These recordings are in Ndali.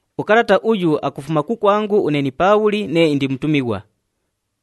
Ukalata uyu akufuma kukwangu une ni Paabhuli nee indi mutumighwa.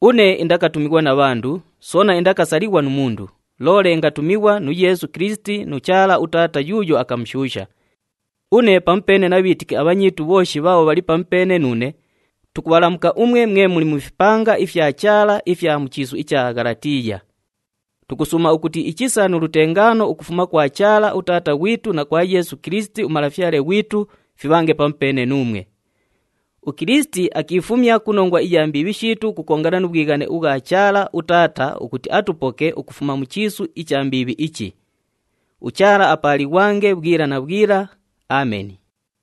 Une indakatumighwa na bhandu, soona indakasalighwa nu mundu, loole ingatumighwa nu Yeesu Kilisiti nu Chaala uTaata yuuyo akamushuusha. Une pamupeene na bhiitiki abhanyiitu bhooshi bhaabho bhali pamupeene nuune tukubhalamuka umwe mwe muli mu fipanga ifya Chaala ifya mu chiisu icha Ghalatiiya. Tukusuuma ukuti ichisa nu lutengaano ukufuma kwa Chaala uTaata ghwitu na kwa Yeesu Kilisiti uMalafyale ghwitu fibhange pamupeene nuumwe. UKilisiti akiifumya ku nongwa iya mbiibhi shiitu ukukongana nu bhwighane ubhwa Chaala uTaata ukuti atupoke ukufuma mu chiisu icha mbiibhi ichi. UChaala apaalighwange bhwila na bhwila. Ameni.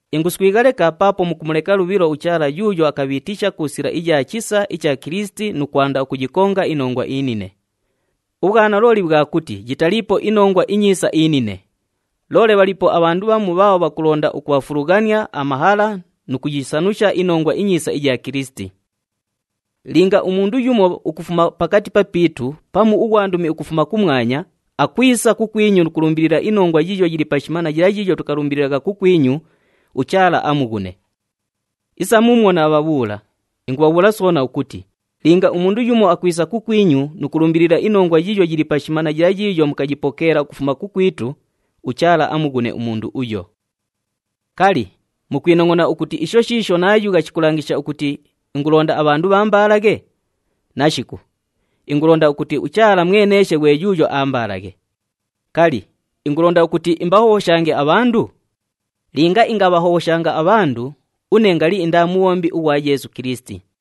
Inguswigha leka paapo mukumuleka lubhilo uChaala yuuyo akabhiitisha ku sila iya chisa icha Kilisiti nu kwanda ukuyikonga inongwa inine. Ubhwanalooli bhwa kuti yitaliipo iNongwa iNyiisa inine. Loole bhaliipo abhandu bhamu bhaabho bhakulonda ukubhafulughania amahala nu kuyisanusha iNongwa iNyiisa iya Kilisiti. Linga umundu yumo ukufuma pakati papiitu pamu ughwandumi ukufuma kumwanya akwisa kukwinyu nu kulumbilila inongwa yiiyo yili pashima na yila yiiyo tukalumbililagha kukwinyu, uChaala amughune. Isa muumwo naabhabhuula, ingubhabhuula soona ukuti linga umundu yumo akwisa kukwinyu nu kulumbilila inongwa yiiyo yili pashima na yila yiiyo mukayipokeela ukufuma kukwitu, uChaala amughune umundu uyo. Kali, mukwinongʼona ukuti isho shiisho naayugha shikulangisha ukuti ingulonda abhandu bhaambaalaghe? Nashiku, ingulonda ukuti uChaala mweneeshe ghwe yuuyo aambaalaghe. Kali, ingulonda ukuti imbahobhoshange abhandu? Linga ingabhahobhoshanga abhandu, une ngali indaa mubhombi ughwa Yeesu Kilisiti.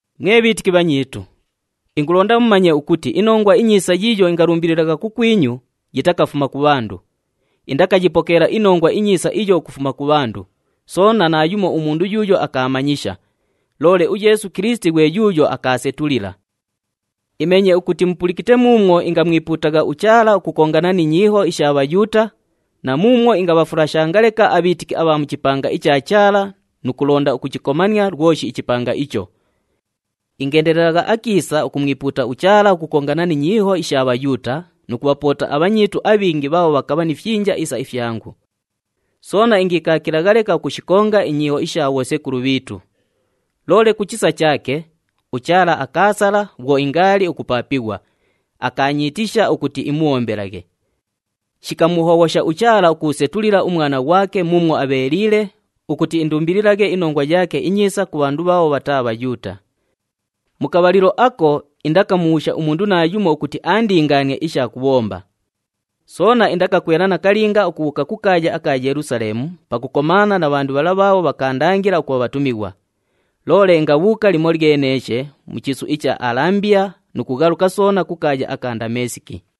Mwe bhiitiki bhanyiitu, ingulonda mumanye ukuti iNongwa iNyiisa yiiyo ingalumbililagha kukwinyu yitakafuma ku bhandu. Indakayipokeela iNongwa iNyiisa iyo ukufuma ku bhandu, soona naayumo umundu yuuyo akaamanyisha. Loole uYeesu Kilisiti ghwe yuuyo akaasetulila. Imeenye ukuti mupulikite muumwo ingamwipuutagha uChaala ukukongana ni nyiiho isha Bhayuuta na muumwo ingabhafulashanga leka abhiitiki abha mu chipanga icha Chaala nu kulonda ukuchikomania lwoshi ichipanga icho. Ingeendelelagha akiisa ukumwipuuta uChaala ukukongana ni nyiiho isha Bhayuuta nu kubhapoota abhanyiitu abhingi bhaabho bhakabha ni fyinja isa ifyangu. Soona ingiikaakilagha leka ukushikonga inyiiho isha bhosekulu bhiitu. Loole ku chisa chaake, uChaala akaasala na bhwo ingaali ukupaapighwa, akaanyiitisha ukuti imubhombelaghe. Shikamuhobhosha uChaala ukuusetulila uMwana ghwake muumwo abheeliile ukuti indumbililaghe iNongwa yaake iNyiisa ku bhandu bhaabho bhataa Bhayuuta. Mu kabhalilo ako indakamubhuusha umundu naayumo ukuti aandingaanie isha kubhomba. Soona indakakwela nakalinga ukubhuuka ku kaaya aka Yelusaleemu pakukomaana na bhandu bhala bhaabho bhakaandangila ukubha bhatumighwa. Loole ingabhuuka limolyeneeshe mu chiisu icha Alambiya nu kughaluka soona ku kaaya aka Ndameesiki.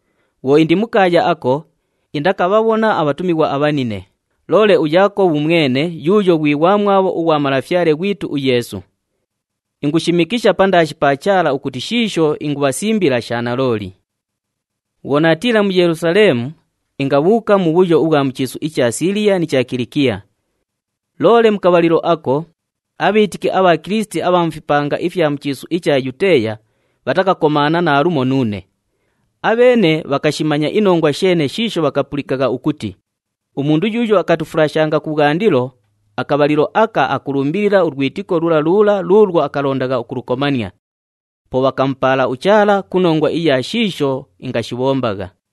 Bhwo indi mu kaaya ako, indakabhabhona abhatumighwa abhanine, loole uYaakobhu mwene yuuyo ghwi ghwamwabho ughwa Malafyale ghwitu uYeesu. Ingushimikisha pandaashi pa Chaala ukuti shiisho ingubhasimbila sha nalooli. Bhwo naatiila mu Yelusaleemu, ingabhuuka mubhuyo ubhwa mu chiisu icha Siiliya ni cha Kilikiya. Loole mu kabhalilo ako, abhiitiki abha Kilisiti abha mu fipanga ifya mu chiisu icha Yuteeya bhatakakomaana naalumo nuune. Abheene bhakashimanya inongwa sheene shiisho bhakapulikagha ukuti, “Umundu yuuyo akatufulashanga kubhwandilo, akabhalilo aka akululumbilila ulwitiko lula lula luulwo akalondagha ukulukomania.” Po bhakamupaala uChaala ku nongwa iya shiisho ingashibhombagha.